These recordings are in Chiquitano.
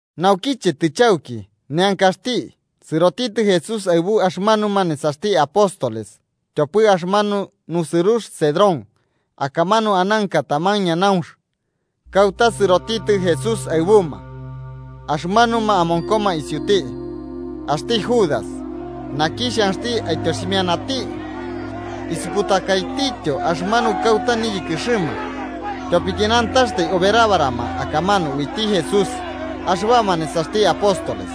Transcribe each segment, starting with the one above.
Naukiche tɨchauki neankaxti, sɨrotitɨ Jesús aɨbu axɨmanuma nesaxti apóstoles tyopɨ axɨmanu nusɨrux Cedrón. Akamanu ananka taman ñanaunx, kauta sɨrotitɨ Jesús aɨbuma axɨmanuma amonkoma isiuti. Axti Judas, naki xhanxti aityoximianati, isuputakaitityo axɨmanu kauta niyɨkɨxɨma, tyopiki nantaxtai oberabarama akamanu uiti Jesús axɨbama nesaxti apóstoles.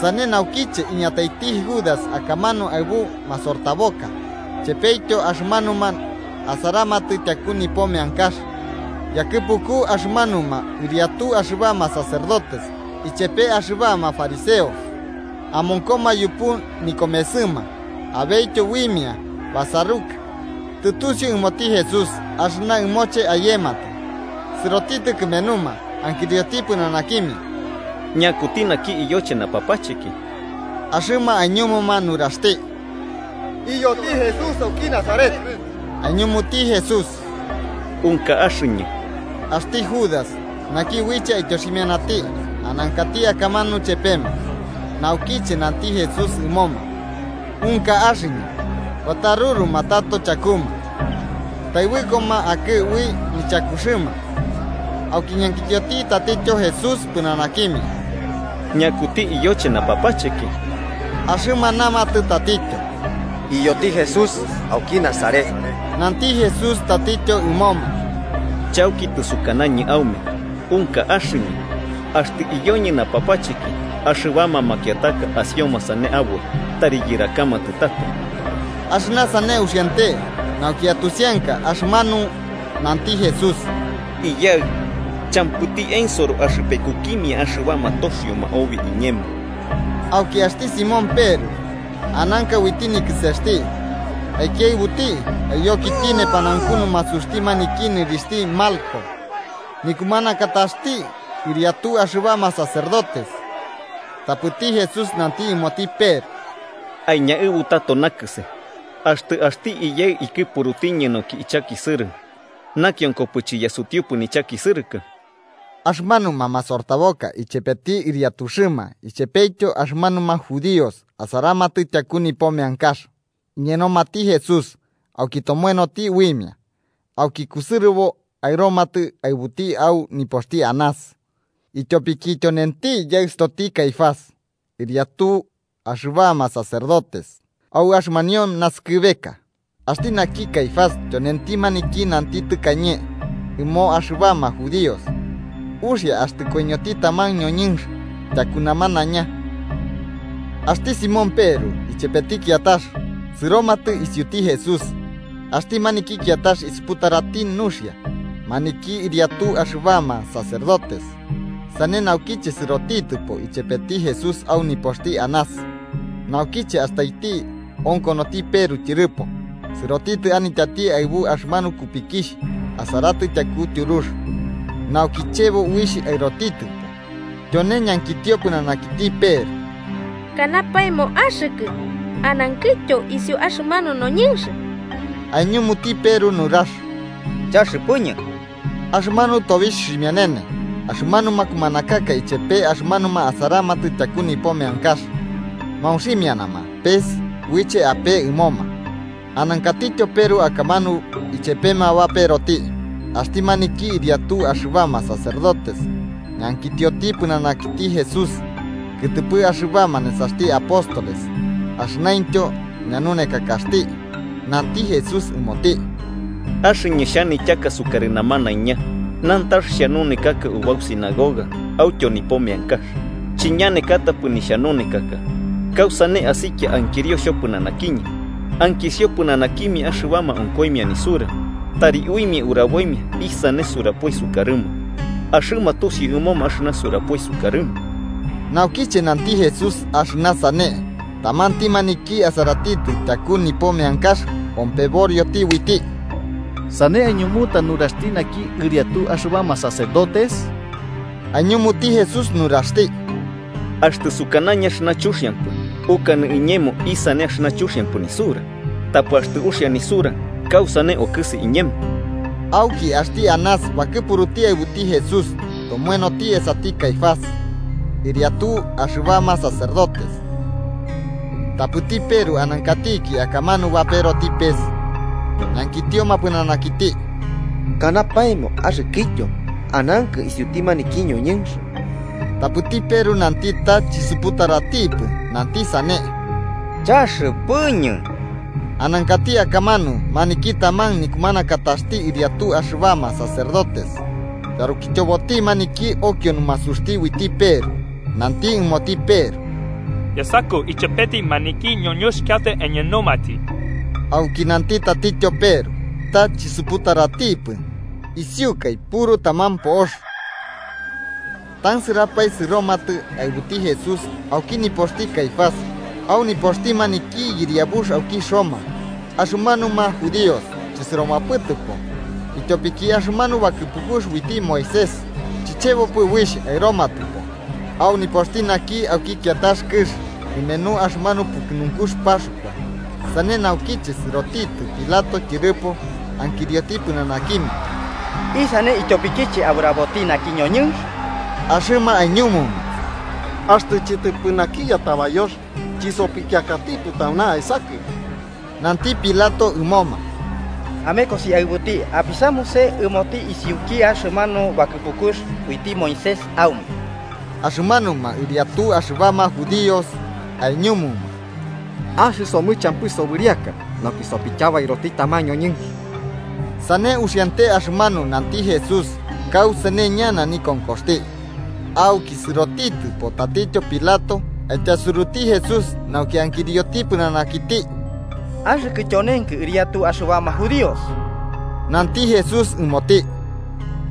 Sane naukiche iñataiti Judas akamanu aɨbu masortaboka chepetyo axɨmanuma asaramatɨ tyaku nipo meankax yakɨpuku axɨmanuma ɨriatu axɨbama sacerdotes ichepe axɨbama fariseos. Amonkoma yupu nikomesɨma abetyo uimia basaruka. Tɨtusiu ɨmoti Jesús axɨna ɨmoche ayematɨ, sɨrotitɨ kɨmenuma ankirioti pɨnanakimia: –¿Ñakuti naki iyoche napapacheki? Axɨma aiñumuma nuraxti: –Iyoti Jesús auki Nazaret. Aiñumuti Jesús: –Unka axɨñɨ. Axti Judas, naki uiche aityoximianati, anankati akamanu chepema. Naukiche nanti Jesús ɨmoma “Unka axɨñɨ”, bataruruma tato chakuma taɨbɨkoma akɨ ui nichakuxɨma. Auki ñankitioti tatityo Jesús pɨnanakimia: –¿Ñakuti iyoche napapacheki? Axɨma namatɨ tatityo: –Iyoti Jesús auki Nazaret. Nanti Jesús tatityo ɨmoma: –Chauki tɨsukanañɨ aume unka axɨñɨ. Axtɨ iyoñɨ napapacheki, axɨbama makiataka asioma sane aboi tari yɨrakamatɨ tato. Axɨna sane uxiante nauki atusianka axɨmanu nanti Jesús: “Iyaɨ champɨti ensoro axɨpekukimia axɨbama toxioma obi iñemo.” Auki axti Simón Peru, ananka uiti nikɨsesti, aikiaɨbuti aiyokiti nepanaunku numasuxti maniki nɨrixhti Malco, nikumanakataxti ɨriatu axɨbama sacerdotes. Tapɨti Jesús nanti ɨmoti Peru: –Aiñaɨbu tato nakɨse. Axtɨ axti Iyaɨ ikɨpurutiñɨ nauki ichakisɨrɨ, ¿nakionko chiyasutiupɨ nichakisɨrɨkɨ? Axɨmanuma masortaboka ichepeti ɨriatuxɨma ichepetyo axɨmanuma judíos asaramatɨ tyaku nipo meankax, iñenomati Jesús auki tomoenoti uimia. Auki kusɨrɨbo aɨromatɨ aɨbuti au nipoxti Anás, ityopiki tyonenti yaɨstoti Caifás, ɨriatu axɨbama sacerdotes au axɨmanio nasɨkɨbeka. Axti naki Caifás tyonenti maniki nanti tɨkañe ɨmo axɨbama judíos, uxia axtɨ koiñoti taman ñoñɨnx tyaku namanaiña. Axti Simón Peru ichepeti kiatax sɨromatɨ isiuti Jesús. Axti maniki kiatax isuputarati nuxia maniki ɨriatu axɨbama sacerdotes, sane naukiche sɨrotitɨpo ichepeti Jesús au nipoxti Anás. Naukiche astaiti onkonoti Peru tyɨrɨpo, sɨrotitɨ anityati aɨbu axɨmanu kupikixh asaratɨ tyaku tyurux, nauki chebo uixh aɨrotitɨpo. Tyone ñankitio pɨnanakiti Peru: –¿Kanapaemo axɨkɨ anankɨtyo isu axɨmanu noñɨnx? –Aiñumuti Peru nurax–chaxɨpɨñɨ Axɨmanu tobixh ximianene, axɨmanuma kumanakaka ichepe axɨmanuma asaramatɨ tyaku nipo meankax, maunximianama pes uiche apee ɨmoma. Anankatityo Peru akamanu ichepema baperoti. Axti maniki ɨriatu axɨbama sacerdotes ñankitioti pɨnanakiti Jesús, kɨtɨpɨ axɨbama nesaxti apóstoles axɨnaintyo ñanunekakaxti. Nanti Jesús ɨmoti: –Axɨñɨ xhanityaka sukarɨ namanaiña. Nantax xhanunekaka ubau sinagoga autyo nipo meankax, chiñanekatapɨ nixhanunekaka. ¿Kausane asikia ankirio xhopɨnanakiñɨ? Ankisio pɨnanakimia axɨbama onkoimia nisura, tari uimia uraboimia isane surapoi sukarɨma. Axɨma tusiu ɨmoma axɨna surapoi sukarɨma. Naukiche nanti Jesús axɨna sane, tamanti maniki asaratɨ tyaku nipo meankax ompeborioti uiti: –¿Sane aiñumuta nuraxti naki ɨriatu axɨbama sacerdotes? Aiñumuti Jesús nuraxti: –Axtɨ sukanañɨ axɨna chuxiampɨ, ukanɨ iñemo isane axɨna chuxiampɨ nisura. Tapɨ axtɨ uxia nisura ¿kausane okɨsi iñemo? Auki axti Anás bakɨpuruti aɨbuti Jesús, tomoenoti esati Caifás, ɨriatu axɨbama sacerdotes. Tapɨti Peru, anankatiki akamanu, baperoti pes. Ñankitioma pɨnanakiti: –¿Kanapaemo axɨkɨtyo anankɨ isiuti maniki noñɨnx? Tapɨti Peru nanti ta chisuputaratipɨ, nanti sane: –Chaxɨpɨñɨ. Anankati akamanu maniki taman nikumanakataxti ɨriatu axɨbama sacerdotes, yarukityoboti maniki okio numasuxti uiti Peru, nanti ɨmoti Peru: –Yasakɨ ichepeti maniki ñoñɨnx kauta aiñenomati. Auki nanti tatityo Peru ta chisuputaratipɨ, isiukai puru taman po'ox. Tansɨrapae, sɨromatɨ aɨbuti Jesús auki nipoxti Caifás au nipo nɨriakaxti maniki yɨriabux auki Roma. Axɨmanuma judíos chɨsɨromapɨtɨpo ityopiki axɨmanu bakɨpukux uiti Moisés chichebopɨ uixh aɨromatɨpo au nipoxti naki auki kiatax kɨx kɨmenu axɨmanu pukɨnunkux Paxkua. Sane naukiche sɨrotitɨ Pilato tyɨrɨpo ankirioti pɨnanakimia: –¿Isane ityopikiche aburaboti naki ñoñɨnx? Axɨma aiñumuma: –Axtɨ chɨtɨpɨ naki yatabayox chisopikiakatipɨ tauna aesakɨ. Nanti Pilato ɨmoma: –Amekosi aɨbuti apisamuse ɨmoti isiuki axɨmanu bakɨpukux uiti Moisés aume. Axɨmanuma ɨriatu axɨbama judíos aiñumuma: –Axɨsomɨ champɨ sobɨriaka nauki sopityabairoti taman ñoñɨnx. Sane uxiante axɨmanu nanti Jesús kausane ñana nikonkoxti. Auki sɨrotitɨpo tatityo Pilato, aityasuruti Jesús nauki ankirioti pɨnanakiti: –¿Axɨkɨ tyonenkɨ ɨriatu axɨbama judíos? Nanti Jesús ɨmoti: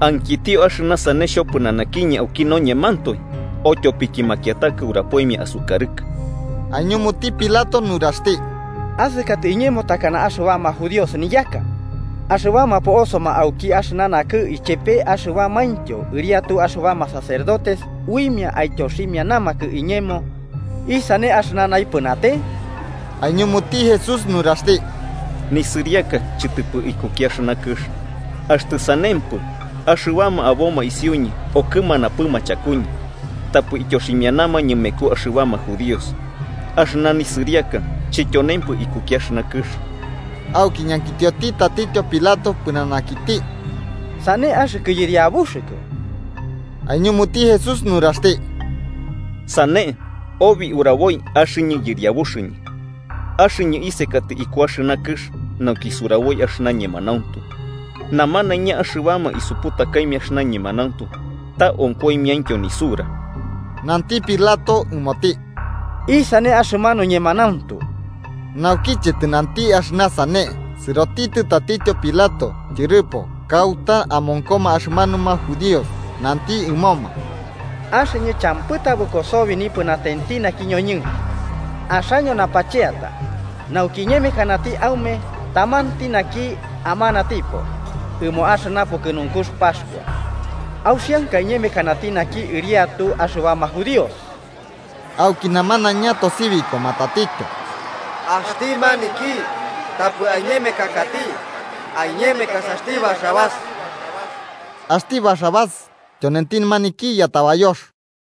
–¿Ankitio axɨna sane xhopɨnanakiñɨ auki noñemantoe, o tyopiki makiataka urapoimia asukarɨkɨ? Aiñumuti Pilato nuraxti: –¿Asakatɨ iñemo takana axɨbama judíos niyaka? Axɨbama po'osoma auki axɨna nakɨ ichepe axɨbamaintyo ɨriatu axɨbama sacerdotes uimia aityoximianamakɨ iñemo. ¿Isane axɨna naipɨnate? Aiñumuti Jesús nuraxti: –Nisɨriaka chɨtɨpɨ ikuki axɨna kɨx. Axtɨ sanempɨ, axɨbama aboma isiuñɨ okɨmanapɨma chakuñɨ, tapɨ ityoximianamañɨ mekuma axɨbama judíos. Axɨna nisɨriaka chityonempɨ ikuki axɨna kɨx. Auki ñankitioti tatityo Pilato pɨnanakiti: –¿Sane, axɨkɨ yɨriabuxɨkɨ? Aiñumuti Jesús nuraxti: –Sane, obi uraboi axɨñɨ yɨriabuxɨñɨ. Axɨñɨ isekatɨ iku axɨna kɨx nauki suraboi axɨna ñemanauntu. Namanaiña axɨbama isuputakaimia axɨna ñemanauntu ta onkoimiaintyo nisura. Nanti Pilato ɨmoti: –¿Isane axɨmanu ñemanauntu? Naukiche tɨnanti axɨna sane, sɨrotitɨ tatityo Pilato tyɨrɨpo kauta amonkoma axɨmanuma judíos, nanti ɨmoma: –Axɨñɨ champɨ tabɨko sobi nipɨnatenti naki ñoñɨnx. Axaño napacheata, nauki iñemekanati aume tamanti naki amanatipo ɨmo axɨna pukɨnunkux Paxkua: ¿Auxianka iñemekanati naki ɨriatu axɨbama judíos? Auki namanaiña tosibikoma tatityo: –¡Axti maniki tapɨ aiñemekakati! ¡Aiñemekasaxti Barrabás! Axti Barrabás tyonenti maniki yatabayoxti.